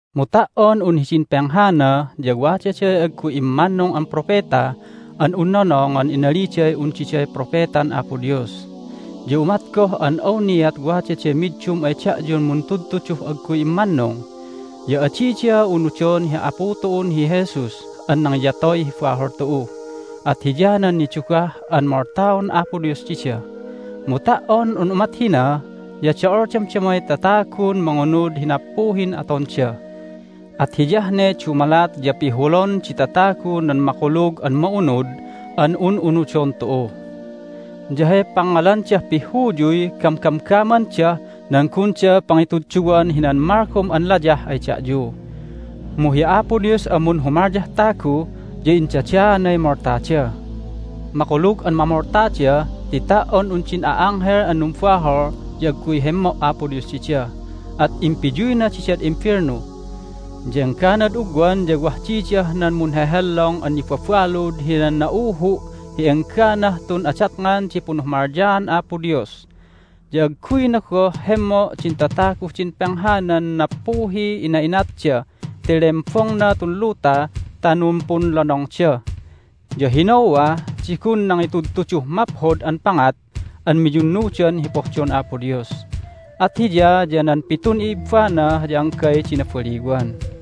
Mu ta"on un hidin penghana ya wadaday agguy immannung an propeta an un nonongan inaliday un diday propetan Apo Dios. Ya umat goh an awniat wadaday middum ay da'yun muntudtuduh agguy immannung, ya adida unudon hi Apu tu'un hi Jesus an nangiyatoy hi bahol tu'u, at hiyanan nidugah an moltaon Apo Dios dida. Mu ta"on un umat hina ya do'ol damdamay tatagun mangunud hi nappuhin atonda. At hiyah ne dumalat ya pihulon di tatagu nan Makulug an Ma'unud an un'unudon tu'u. Ya hay pangngalandah pihhuyuy gamgamgamandah nan gunda pangitudduwan hinan malgom an layah ay da'yu. Mu hi Apo Dios an munhumalyah tagu ya indadaanay moltada! Makulug an mamoltada ti ta"on un din a'anghel an numbahol ya agguy hemmo' Apo Dios dida, at impiyuyna didad imbelnu. Ya engganad ugwan ya wah didah nan munhehellong an nibabalud hinan na'uhu' hi engganah tun adatngan di punhumalyaan Apo Dios. Ya agguyna goh hemmo' din tataguh din penghanan nappuhiy ina'inatda ti lembongna tun luta ta numpunlonongda. Ya hi Noah di gun nangitudtuduh maphod an pangat an miyunnudan hi pohdon Apo Dios, at hiya ya nan pitun i'ibbana ya anggay di nabaliwan.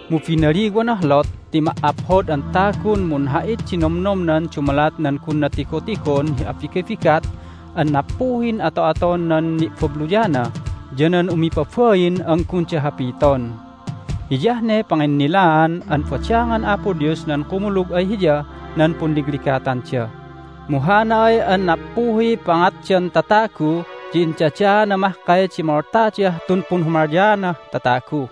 Mu binaliwanah Lot ti ma"aphod an tagun munha'it di nomnomnan dumalat nan gunna tigotigon hi abigabigat an nappuhin ato'aton nan ni'babluyana ya nan umipabain an gunda hapiton. Hiyah ne panginnilaan an badangan Apo Dios nan kumulug ay Hiyah nan punligligatanda, mu hana ay an nappuhiy pangatdan tatagu ya indadaana mahkay di moltadah tun punhumalyaanah tatagu.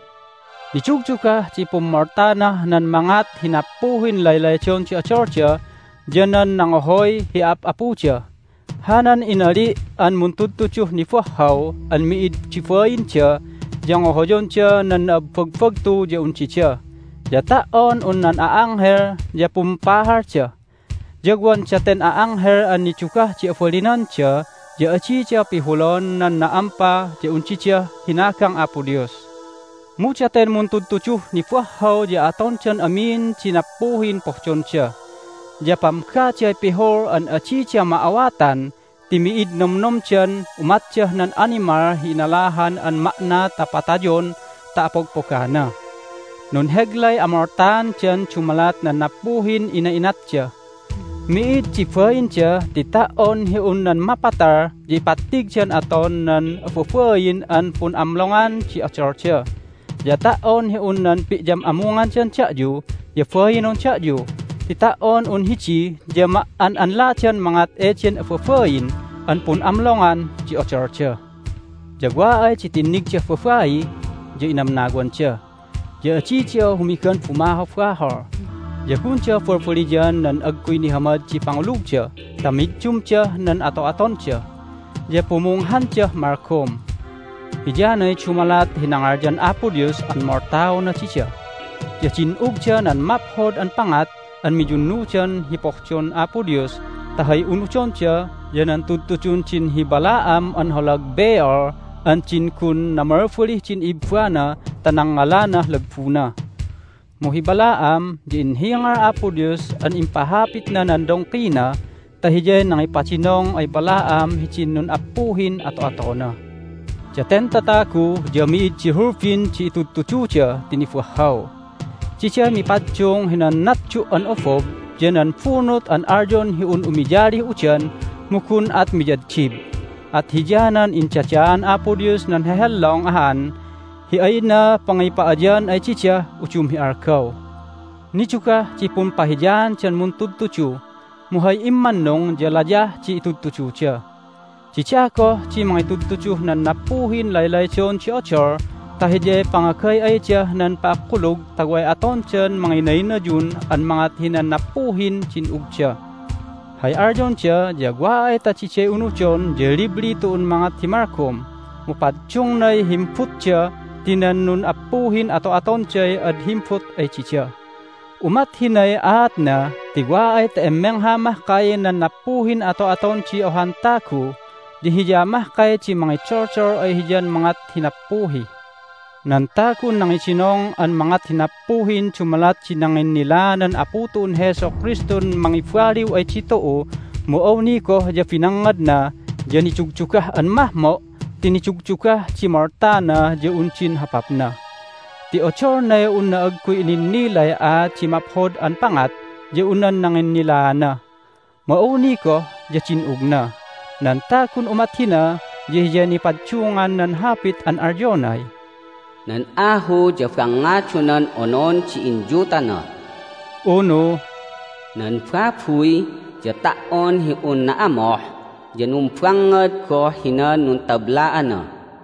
Nidugdugah di pummoltanah nan mangat hi nappuhin laylaydon di odolda ya nan nangohoy hi a'ap'apuda. Hanan inali' an muntudtuduh nibahhaw an mi'id di bainda ya ngohoyonda nan na'abbagbagtu ya un dida, ya ta"on un nan a'anghel ya pumpahalda. Ya wan daten a'anghel an nidugah di abalinanda ya adida pihulon nan na'ampa ya un didah hinagang Apo Dios. Mu daten muntudtuduh nibahhaw ya atondan amin di nappuhin pohdonda, ya pamgaday pihul an adida ma'awatan ti mi'id nomnomdan umatdah nan animal hi inalahan an ma'na ta patayon ta apogpogana. Nunheglay amoltaandan dumalat nan nappuhin ina'inatda. Mi'id di bainda ti ta"on hi un nan mapatal ya ipattigdan aton nan ababain an pun'amlongan di odolda. Ya ta"on hi un nan pi'yam'amungandan da'yu ya bainon da'yu ti ta"on un hidi ya ma"an'anladan mangat eden ababain an pun'amlongan di odolda! Ya wa ay di tinnigdah babai ya inamnawanda. Ya adida humigan bumahobahol, ya gunda balbaliyan nan agguy nihamad di pangulugda ta middumdah nan ato'atonda. Ya pumunghandah malgom. Hiyanay dumalat hi nangalyan Apo Dios an moltaona dida. Ya din'ugda nan maphod an pangat an miyunnudan hi pohdon Apo Dios ta hay unudonda ya nan tudtudun din hi Balaam an holag Beor an din gun namalbalih din i'ibbana ta nangngalanah lagbuna. Mu hi Balaam ya inhingal Apo Dios an impahapitna nan dongkina ta hiyay nangipadinong ay Balaam hidin nun'appuhin ato'atona. Daten tatagu ya mi'id di hulbin di itudtududa ti nibahhaw. Diday mipaddung hinan natdu' an obob ya nan bunut an alyon hi un umiyalih udan mu gun at miyaddib. At hiyanan indadaan Apo Dios nan hehellong ahan hi ayna pangipa'ayan ay didah udum hi algaw. Nidugah di pumpahiyaandan muntudtudu, mu hay immannung ya layah di itudtududa. Dida goh di mangitudtuduh nan nappuhin laylaydon di odol ta hiyay pangagay'aydah nan pa'akullug ta way atondan manginaynayun an mangat hinan nappuhin din'ugda. Hay alyonda ya wa ay ta diday unudon ya libli tu'un mangat hi malgom, mu paddungnay himbutda ti nan nun'appuhin ato'atonday ad himbut ay dida. Umat hinay aatna ti wa ay ta immengha mahkay nan nappuhin ato'aton di ohan tagu ya hiya mahkay di mangidoldol ay hiyan mangat hi nappuhi. Nan tagun nangidinong an mangat hi nappuhin dumalat di nanginnilaanan Apu tu'un hi Jesu Kristun mangibaliw ay ditu'u mu awni goh ya binangngadna ya nidugdugah an mahmo' ti nidugdugah di moltana ya un din hopapna! Ti odolnay unna agguy ininnilay aat di maphod an pangat ya un nan nanginnilaana, mu awni goh ya din'ugna! Nan tagun umat hina ya hiyay nipaddungan nan hapit an alyonay, "Nan ahu ya bangngadonan onon di inyutana." Unu, "Nan babuy ya ta"on hi un na'amoh ya numbangngad goh hinan nuntabla'ana."